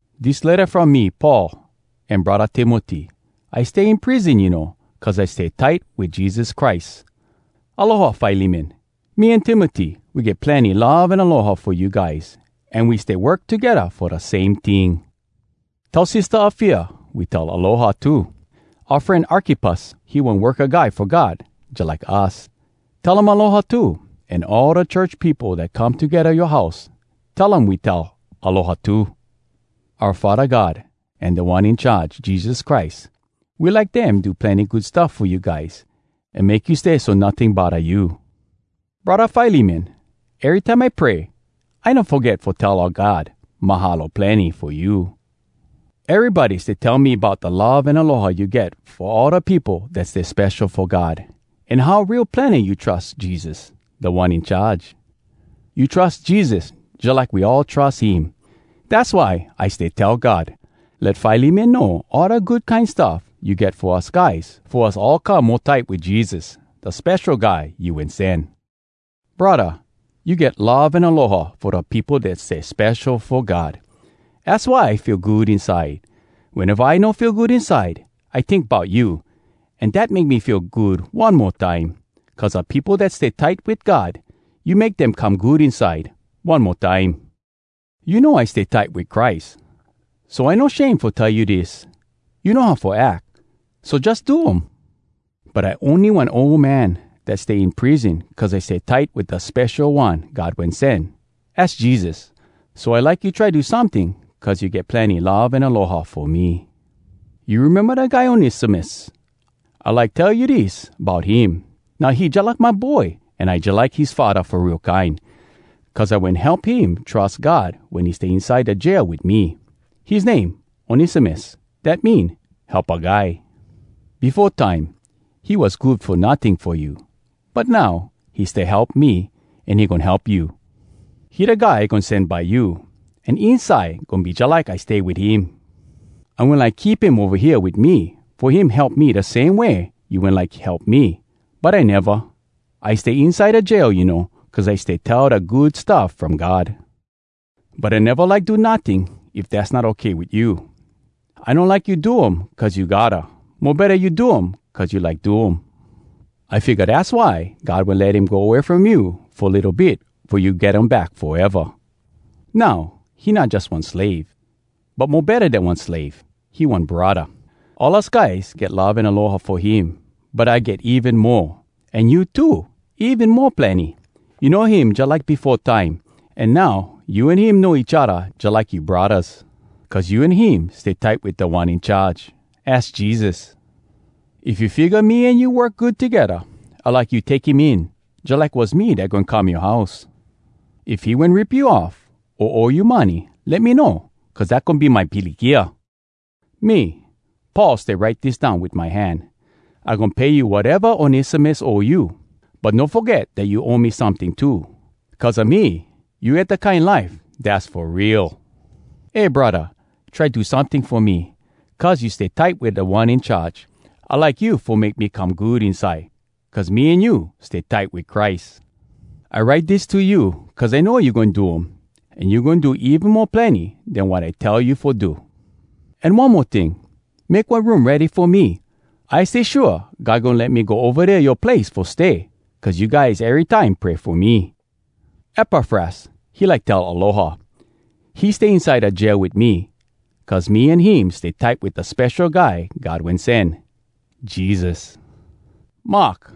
Dis letta from me Paul, an Braddah Timoty. I stay in prison, you know, cuz I stay tight wit Jesus Christ. Aloha, Filemon! Me an Timoty, we get plenny love an aloha fo you guys, an we stay work togedda fo da same ting. Tell Sistah Afia we tell “Aloha!” too. Oua fren Arkippus, he one worka guy fo God jalike us. Tell him “Aloha!” too, an all da church peopo dat come togedda yoa house, tell um we tell “Aloha!” too. Oua Faddah God, an Da One In Charge, Jesus Christ, we like dem do plenny good stuff fo you guys, an make you stay so notting bodda you. Braddah Filemon, erytime I pray, I no foget fo tell oua God “Mahalo plenny!” fo you. Erybody stay tell me bout da love an aloha you get fo all da peopo dat stay spesho fo God, an how real plenny you trus Jesus, Da One In Charge. You trus Jesus jalike we all trus him. Dass why I stay tell God, “Let Filemon know all da good kine stuff you get fo us guys fo us all come mo tight wit Jesus, da Spesho Guy You Wen Sen!” Braddah, you get love an aloha fo da peopo dat stay spesho fo God. Az why I feel good inside. Weneva I no feel good inside, I tink bout you, an dat make me feel good one mo time. Cuz da peopo dat stay tight wit God, you make dem come good inside one mo time. You know, I stay tight wit Christ, so I no shame fo tell you dis: you know how fo ack, so jus do um. But I ony one ol man dat stay in prison cuz I stay tight wit Da Spesho One God Wen Sen, az Jesus. So I like you try do someting cuz you get plenny love an aloha fo me. You rememba da guy Onesimus? I like tell you dis bout him: Now, he jalike my boy, an I jalike his faddah fo real kine, cuz I wen help him trus God wen he stay inside da jail wit me. His name Onesimus, dat mean Helpa Guy! Befo time, he was good fo notting fo you. But now, he stay help me, an he goin help you. He da guy I goin sen by you, an inside, goin be jalike I stay wit him. I wen like keep him ova hea wit me, fo him help me da same way you wen like help me, but I neva. I stay inside da jail, you know, cuz I stay tell da Good Stuff From God. But I neva like do notting if dass not okay wit you. I no like you do um cuz you gotta! Mo betta you do um cuz you like do um. I figga dass why God wen let him go way from you fo litto bit fo you get him back foeva. Now, he not jus one slave, but mo betta den one slave! He one braddah! All us guys get love an aloha fo him, but I get even mo, an you too, even mo plenny! You know him jalike befo time, an now you an him know each odda jalike you braddahs, cuz you an him stay tight wit Da One In Charge, az Jesus. If you figga me an you work good togedda, I like you take him in, jalike was me dat goin come yoa house. If he wen rip you off, o owe you money, let me know, cuz dat goin be my pilikia. Me, Paul stay write dis down wit my hand. I goin pay you wateva Onesimus owe you. But no foget dat you owe me someting too—cuz a me, you get da kine life dass fo real! Eh, braddah, try do someting fo me. Cuz you stay tight wit Da One In Charge, I like you fo make me come good inside, cuz me an you stay tight wit Christ. I write dis to you, cuz I know you goin do um, an you goin do even mo plenny den wat I tell you fo do. An one mo ting, make one room ready fo me. I stay shua God goin let me go ova dea yoa place fo stay, cuz you guys erytime pray fo me. Epafras, he like tell “Aloha!” He stay inside da jail wit me, cuz me an him stay tight wit da Spesho Guy God Wen Sen, Jesus. Mark,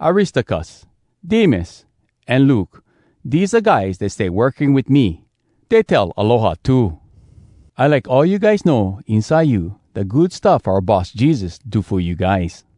Aristarkus, Demas, an Luke, dese da guys dey stay working wit me, dey tell “Aloha!” too. I like all you guys know inside you da good stuff oua Boss Jesus do fo you guys.